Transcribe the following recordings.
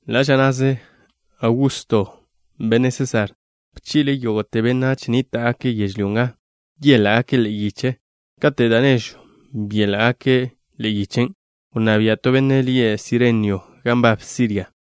Ḻa' ža na'ze Augusto, benne' Sésar, bchi'le' yógo'te benách nníta'gake' yežlyó nga yéla'gake' ḻe'e yich. Kate' da' nežw byéla'gake' ḻe'e yichen', wnná bia' to benne' lie' Sirenio gan nbab Siria.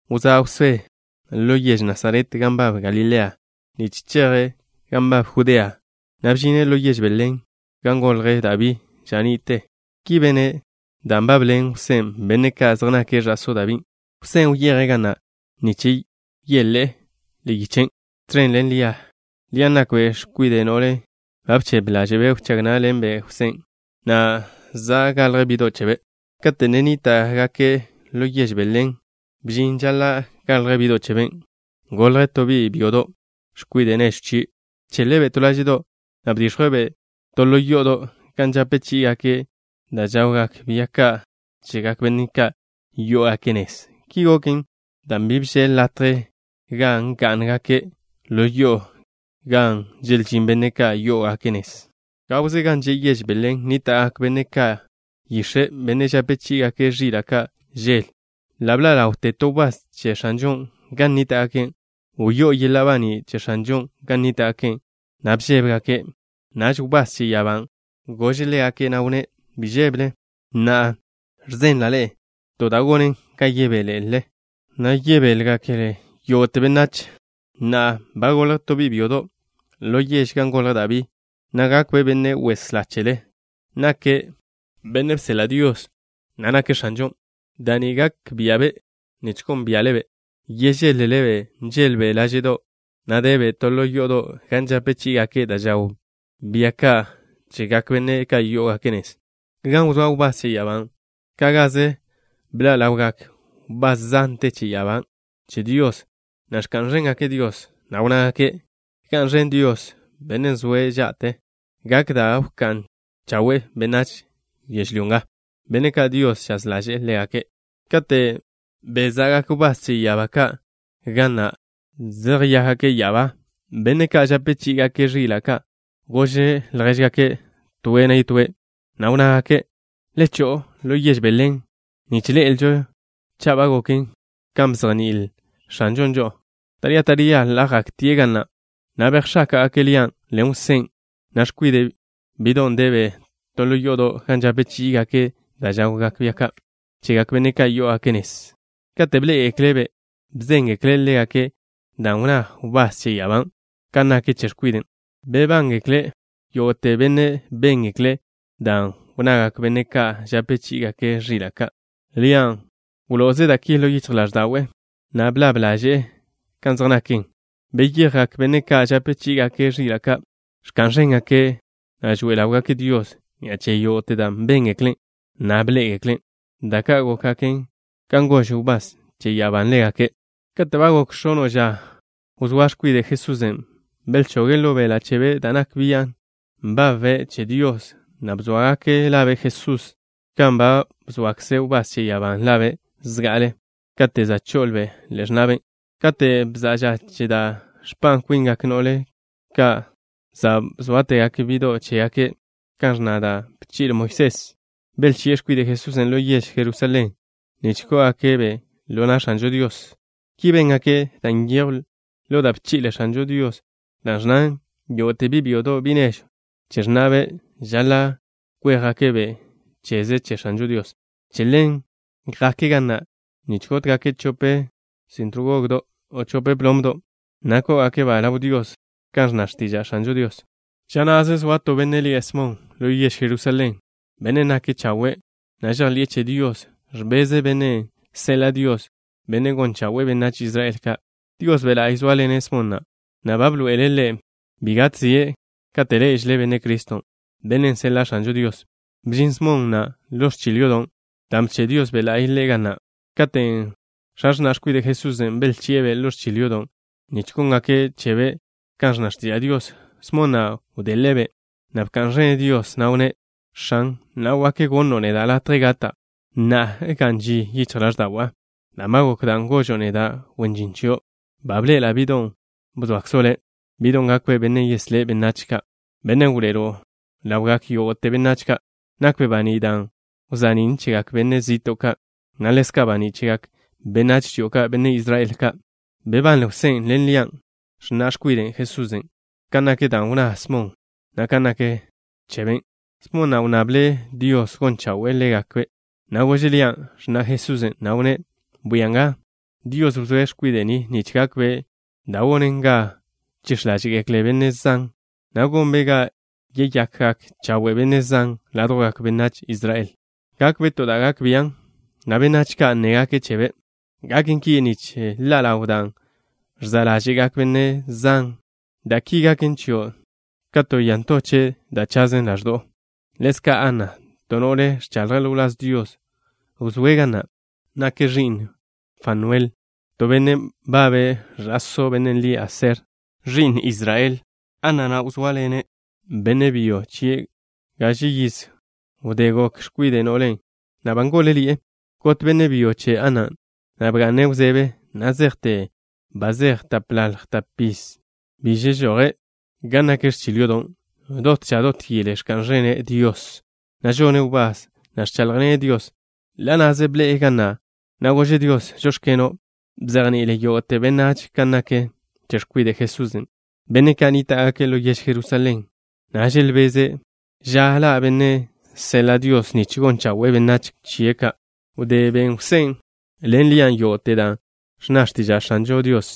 Wzá' Jwsé ḻo yež Nasaret gan nbab Galilea, nich cheje' gan nbab Judea, na' bžine' ḻo yež Belén, gan golj Dabí ža ni'te. Ki bene' dan' nbabḻen Jwsén' benne' ka' zej nake' ẕa'só Dabín'. Jwsén' wyeje' ga na' nich yéle'e ḻe'e yichen', tẕen ḻen Lia. Lian' nakbe' x̱kwide' no'len' ba bchebe ḻáže'be' wchág ná'ḻenbe' Jwsén', na' za' galj bi'do' chebe'. Kate' ne nníta'gake' ḻo yež Belén, bžin ža žaḻa' galj bi'do' cheben'. Golj to bi' byodo', x̱kwide' nežw chie'. Bcheḻe'-be' to láže'do', na' bdix̱jwe'-be' to ḻo yo'odo' gan žape chí'igake' da' žawgak bia ka' chegak benne' ka' yó'ogake' nez. Ki goken dan' bi bžeḻ latje gan gá'ngake' ḻo yo'o gan želžín benne' ka' yó'ogake' nez. Gawze gan že' yež Belén nníta'gak benne' ka' yix̱e', benne' žape chí'igake' ẕila' ka' žel. Ḻa' bḻa' ḻawte to wbás che X̱anžon' gan nníta'gake'. Wyó'o yeḻa' baní' che X̱anžon' gan nníta'gake', na' bžébegake'. Naž wbás che ya'abán' gože' ḻégake', na' wnné': —Bi žébele. Na'a ẕzenla' ḻe'e to da' gonen ga yebélele, na' yebéḻengeklen yógo'te benách. Na'a ba golj to bi' byodo' ḻo yež gan golj Dabí, na' gakbe' Benne' Weslá chele. Nake' benne' bseḻa' Dios, na' nake' X̱anžon'. Da' ni gak bia'be' nich gónbia'le-be'. Yežeḻ-lele-be', nžeḻbe' láže'do', na' debe' to ḻo yo'odo' gan žape chí'igake' da' žawgak bia ka' chegak benne' ka' yó'ogake' nez. Gan wzóa wbás che ya'abán', ka' gaze bḻa' ḻawgak wbás zante che ya'abá che Dios, na' ẕka'n ẕéngake' Dios, na' wnnágake': ¡Ga'n ẕen Dios, Bennen' zoe' ža'te! Gak da' wká'n chawen' benách yežlyó nga, benne' ka' Dios žaz ḻaže'e ḻégake'. Kate' beza'gak wbás che ya'abá ka' ga na', zeyéjgake' ya'abá, benne' ka' žape chí'igake' ẕila' ka' gož ljéžgake' toe' yetóe', na' wnnágake': —Le cho'o ḻo yež Belén nich ḻe'elžo cha' ba goken kan bzejní'il X̱anžon' žo'o. Taría taría ḻa' jaktie' ga na', na' bejx̱áka'gake' Lian' ḻen Jwsén', na' x̱kwiden', bi'don' debe' to ḻo yo'odo' gan žape chí'igake' da' žawgak bia ka' chegak benne' ka' yó'ogake' nez. Kate' bḻé'egekle'-be', bzéngekle' ḻégake' dan' wnná wbás che ya'abán', kan nak che x̱kwiden'. Bebángekle yógo'te benne' béngekle' dan' wnnagak benne' ka' žape chí'igake' ẕila' ka'. Lian' wlo'oze' da' ki ḻo yichj ḻáẕda'we', na' blab ḻaže'e kan zej naken. Beyejgak benne' ka' žape chí'igake' ẕila' ka', ẕka'n ẕéngake', na' žoe ḻáwgake' Dios ni'a che yógo'te dan' béngeklen', na' bḻé'egeklen', da' ka' gókgaken kan gož wbás che ya'abán' ḻégake'. Kate' ba gok x̱ono' ža wzóa x̱kwide' Jesusen', belchoge' ḻo beḻa' chebe' da' nak bian' nbabbe' che Dios, na' bzóagake' labe' Jesús kan ba bzoakze wbás che ya'abán' labe' zga'ale kate' za' cho'obe' ḻe'e x̱na'be'. Kate' bza'a ža che da' ẕpa' kwingak no'le ka' za' bzóategake' bi'do' chégake' kan ẕnna da' bchi'le Moisés, belchi'e x̱kwide' Jesusen' ḻo yež Jerusalén nich kó'ogake'-be' ḻo na' X̱anžo Dios. Ki béngake', dan' nyejw ḻo da' bchi'le X̱anžo Dios, dan' ẕnnan: “Yógo'te bi' byodo', bi' nežw che x̱na'be', žaḻa' kwéjgake'-be' cheze che X̱anžo Dios.” Che ḻen jake' ga na' nich gótgake' chope sintr gog, o chope plomdo' ka', na' kó'ogake'-ba' ḻaw Dios, kan ẕnna x̱tiža' X̱anžo Dios. Ža na'ze zoa to benne' lie' Smon ḻo yež Jerusalén, bennen' nake' chawe', na' žejḻi'e che Dios. Ẕbeze' Bennen' seḻa' Dios, Bennen' gon chawe'e benách Israel ka'. Dios Be' La'y zóaḻene' Smon na', na' ba bḻoe'ele' ḻe' bi gatzie' kate' ḻé'ežele' Benne' Criston', Bennen' seḻa' X̱anžo Dios. Bžin Smon na' ḻo ẕchil yodo' dan' bche' Dios Be' La'y ḻe' ga na'. Katen' x̱a x̱na' x̱kwide' Jesusen' belchi'e-be' ḻo ẕchil yodo' nich góngake' chebe' kan ẕnna x̱tiža' Dios, Smon na' wdele'-be', na' bka'n ẕene' Dios, na' wnné': X̱an, na'a wak gonno' neda' latje gata', na' ga'n ži yichj ḻáẕda'wa', dan' ba gok dan' gožo' neda', wen žin chio'. Ba bḻe'ela' bi'don' bzoakzo' Le', bi'don' gakbe' Bennen' yeslé' benách ka', Bennen' wḻoe'elo' ḻaw ḻawgak yógo'te benách ka'. Nakbe' baní' dan' wza'nín' chegak benne' zi'to' ka', na' ḻezka' baní' chegak benách chio', benne' Israel ka'. Bebanle Jwsén' ḻen Lian', x̱na' x̱kwide' Jesusen', kan nak dan' wnná Smon na' kan nak chebe'. Smon na' wnnable' Dios gon chawe'e ḻégake', na' gože' Lian', x̱na' Jesusen', na' wnné': —Bwia nga. Dios bzoe' X̱kwide' ni nich gakbe' da' gonen ga chix̱ ḻáže'gekle benne' zan, na' gonbe' ga yeyakgak chawe' benne' zan ládjwgak benách Israel. Gakbe' to da' gak bian', na' benách ka' nnégake' chebe'. Gaken ki nich ḻa' ḻaw dan' ẕza' ḻáže'gak benne' zan. Da' ki gaken chio' ka to ya ntoche' da' chazen ḻaẕdo'o. Ḻezka' Ana, to no'le ẕchaḻje' ḻo wláz Dios, wzóe' ga na'. Nake' ẕi'n Fanuel, to benne' nbabe' ẕa'só bennen' lie' Aser, ẕi'n Israel. Ana na' wzóaḻene' benne' byo chie' gaže yiz wdé goke' x̱kwide' no'le, na' ba ngól-ḻi'e. Got benne' byo che Anan', na' bga'ne' wzebe na' zejte ba zeje' tapḻalj tapiz. Bi žežoje' gan nak ẕchil yodon'. Dot ža dot yele, ẕka'n ẕene' Dios, na' žone' wbás, na' ẕcháḻjḻene' Dios. Ḻa' na'ze bḻe'e ga na', na' gože' Dios: “Žóx̱keno'.” Bzejni'ile' yógo'te benách kan nak che x̱kwide' Jesusen', benne' ka' nníta'gake' ḻo yež Jerusalén, na' želbeze' ža ḻa' Bennen' seḻa' Dios nich gon chawe'e benách chie' ka'. Wdé ben Jwsén' ḻen Lian' yógo'te dan' ẕnna x̱tiža' X̱anžo Dios,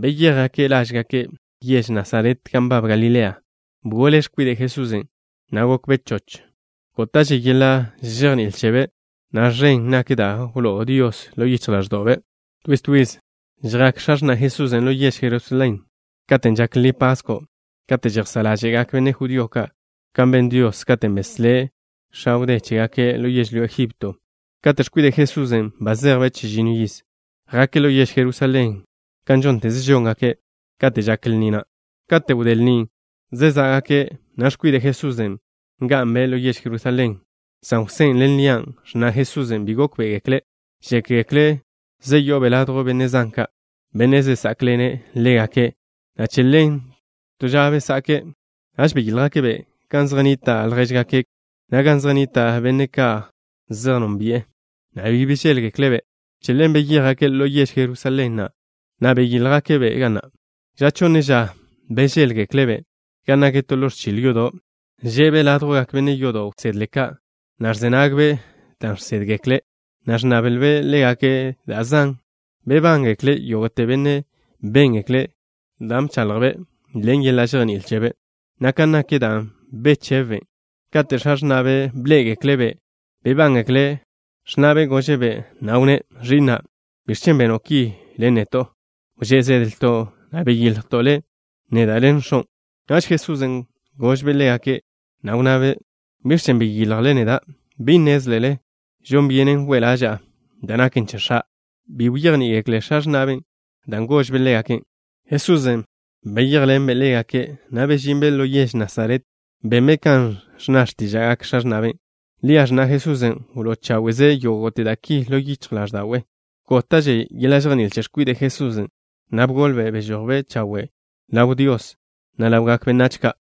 beyéjgake' lážgake', yež Nasaret gan nbab Galilea. Bgole x̱kwide' Jesusen', na' gokbe' choch. Góta'že yeḻa' žejní'il chebe', na' ẕen nak da' wló'o Dios ḻo yichj ḻáẕdo'be'. Twiz twiz žjak x̱a x̱na' Jesusen' ḻo yež Jerusalén katen' žak Lni Pasko', kate' žejsá' ḻáže'gak benne' judío ka' kan ben Dios, katen' beslé' x̱a wdé chégake' ḻo yežlyó Egipto. Kate' x̱kwide' Jesusen' ba zejbe' chežinno yiz, jake' ḻo yež Jerusalén kan žónteze žóngake' kate' žak lni na'. Kate' wdé lnin', zezá'gake', na' x̱kwide' Jesusen' nga'nbe' ḻo yež Jerusalén, san Jwsén' ḻen Lian', x̱na' Jesusen', bi gókbe'egeklen'. Žékgekle' zeyo'obe' ladjw benne' zan ka', benne' zesá'kḻene' ḻégake', na' che ḻen to ža besa'ke'. Naž beyíljgake'-be' gan zej nnita' ljéžgake', na' gan zej nnita' benne' ka' zej nónbi'e, na' bi bežéḻgekle'-be'. Che ḻen beyéjgake' ḻo yež Jerusalén, na' beyíljgake'-be' ga na'. Ža chonne ža, bežéḻgekle'-be' gan nak to ḻo ẕchil yodo', že'be' ládjwgak benne' yodo' wsedle ka', na' ẕze nagbe' dan' žsédgekle', na' ẕnnablbe' ḻégake' da' zan. Bebángekle yógo'te benne' béngekle' dan' bchaḻjbe' ḻen yeḻa' žejní'il chebe', na' kan nak dan' bechebbe'. Kate' x̱a x̱na'be' bḻé'egekle'-be', bebángekle'. X̱na'be' gože'-be', na' wnné': —Ẕi'na', ¿biẕ chen' beno' ki ḻen neto'? Wžé' zedlto', na' beyiljto' le', neda' ḻen x̱on'. Naž Jesusen' gožbe' ḻégake', na' wnnabe': —¿Biẕ chen' beyiljle neda'? ¿Bi nnézlele žon byenen we' ḻaža'a da' naken che X̱a'? Bi bejní'igekle x̱a x̱na'be' dan' gožbe' ḻégake'. Jesusen' beyéjḻenbe' ḻégake', na' bežinbe' ḻo yež Nasaret. Benbe' kan ẕnna x̱tíža'gak x̱a x̱na'be'. Lia, x̱na' Jesusen', wló' cháwe'ze' yógo'te da' ki ḻo yichj ḻáẕda'we'. Góta'že yeḻa' žejní'il che x̱kwide' Jesusen', na' bgolbe'. Bežojbe' chawe' ḻaw Dios, na' ḻawgak benách ka'.